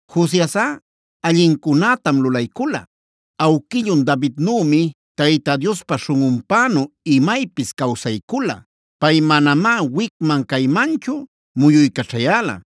Josiasꞌa allincunätam lulaycula. Awquillun Davidnümi Tayta Diospa śhunꞌunpänu imaypis cawsaycula. Pay manamá wicman caymanchu muyuycaćhayäla.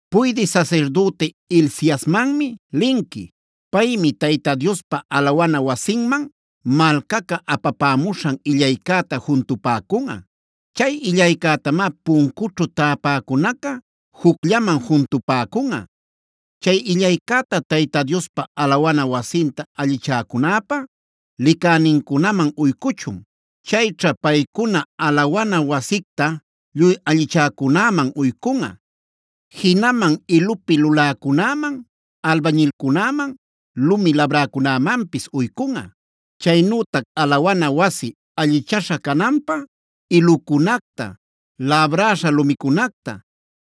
“Puydï sasirdüti Hilciasmanmi linqui. Paymi Tayta Diospa alawana wasinman malcaca apapämuśhan illaycäta juntupäcunꞌa. Chay illaycätamá puncućhu täpäcunaca jucllaman juntupäcunꞌa. Chay illaycäta Tayta Diospa alawana wasinta allichäcunäpa licänincunaman uycuchun. Chayćha paycuna alawana wasicta lluy allichäcunäman uycunꞌa. Jinaman ilupi luläcunäman, albañilcunäman, lumi labräcunämanpis uycunꞌa. Chaynütac alawana wasi allichaśha cananpä ilucunacta, labräśha lumicunacta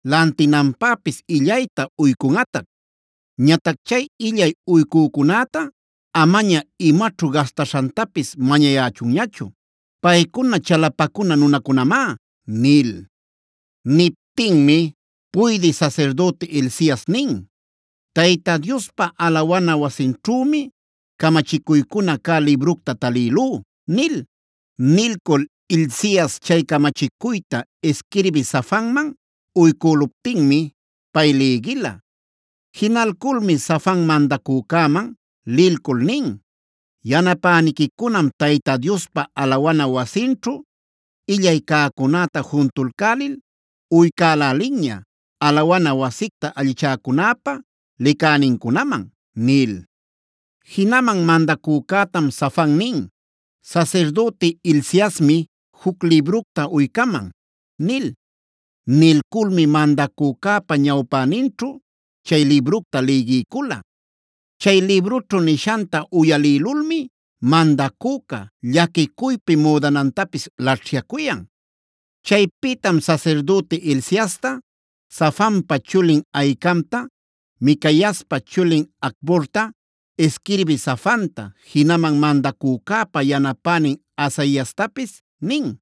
lantinanpäpis illayta uycunꞌatac. Ñatac chay illay uycücunäta amaña imaćhu gastaśhantapis mañayächunñachu. Paycuna chalapacuna nunacunamá” nil. Niptinmi puydï sasirdüti Hilcias nin: “Tayta Diospa alawana wasinćhümi camachicuycuna cä libructa talïlú” nil. Nilcul Hilcias chay camachicuyta isquirbï Safanman uycüluptinmi pay lïgila. Jinalculmi Safan mandacücäman lilcul nin: “Yanapäniquicunam Tayta Diospa alawana wasinćhu illay cäcunäta juntulcälil uycälälinña, alawana wasicta allichäcunäpä licänincunaman” nil. Jinaman mandacücätam Safan nin: “Sasirdüti Hilciasmi juc libructa uycaman” nil. Nilculmi mandacücäpa ñawpäninćhu chay libructa lïgiycula. Chay librućhu nishanta uyalïlulmi mandacüca, llaquicuypi müdanantapis laćhyacuyan. Chaypïtam sasirdüti Hilciasta, Safanpa chulin Ahicamta, Micaiaspa chulin Acborta, isquirbï Safanta, jinaman mandacücäpa yanapänin Asaiastapis nin: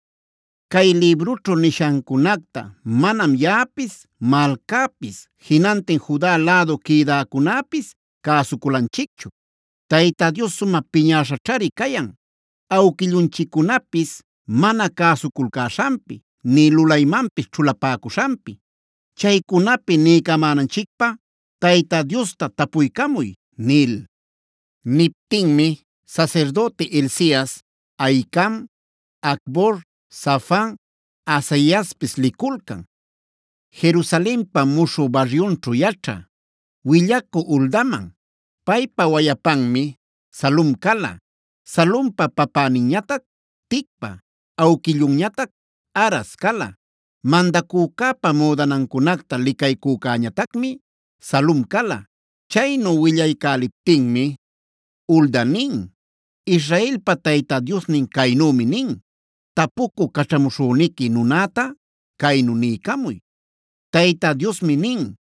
“Cay librućhu nishancunacta manam yaꞌapis, malcäpis, jinantin Juda lädu quïdäcunäpis cäsuculanchicchu. Tayta Dios sumä piñäśhaćhari cayan, awquillunchiccunapis mana cäsuculcäśhanpi nï lulaymanpis ćhulapäcuśhanpi. Chaycunapi niycamänanchicpä Tayta Diosta tapuycamuy” nil. Niptinmi sasirdüti Hilcias, Ahicam, Acbor, Safan, Asaiaspis liculcan, Jerusalenpa muśhü baryunćhub yaćhä willacü Huldaman. Paypa wayapanmi Salum cala, Salumpa papäninñatac Ticva, awquillunñatac Harhas cala. Mandacücäpa müdanancunacta licaycücäñatacmi Salum cala. Chaynu willaycäliptinmi, Hulda nin: “Israelpa Tayta Diosnin caynümi nin: Tapucü caćhamuśhüniqui nunäta caynu niycamuy: Tayta Diosmi nin: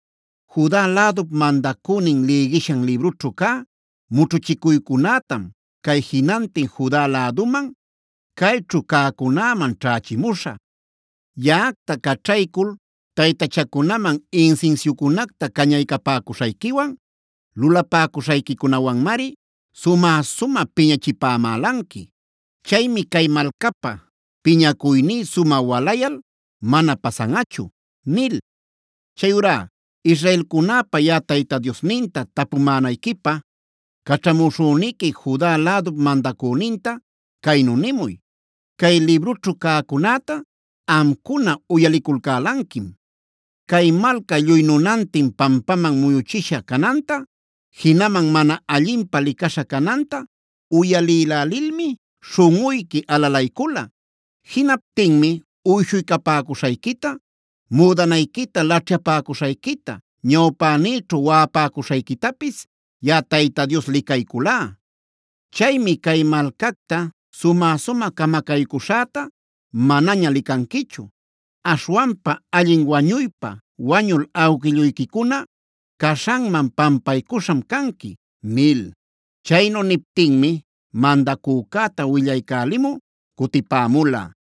‘Juda lädup mandacünin lïgishan librućhu cä mućhuchicuycunätam, cay jinantin Juda läduman, cayćhu cäcunäman ćhächimuśhä. Yaꞌacta caćhaycul taytachacunaman insinsiucunacta cañaycapäcuśhayquiwan lulapäcuśhayquicunawanmari, sumä-sumä piñachipämälanqui. Chaymi cay malcapä piñacuyní sumä walayal mana pasanꞌachu’ nil. Chayurá israelcunap yaꞌa Tayta Diosninta tapumänayquipä caćhamuśhüniqui, Juda lädup mandacüninta caynu nimuy: ‘Cay librućhu cäcunäta amcuna uyaliculcälanquim. Cay malca lluy nunantin pampaman muyuchisha cananta, jinaman mana allinpä licaśha cananta uyalïlälilmi śhunꞌuyqui alalaycula. Jinaptinmi uyshuycapämuśhayquita, müdanayquita laćhyapäcuśhayquita, ñawpänïćhu waꞌapäcuśhayquitapis yaꞌa Tayta Dios licayculá. Chaymi cay malcacta sumä-sumä camacaycuśhäta manaña licanquichu. Aśhwanpa allin wañuypa wañul awquilluyquicuna caśhanman pampaycuśham canqui’” nil. Chaynu niptinmi mandacücäta willaycälimü cutipämula.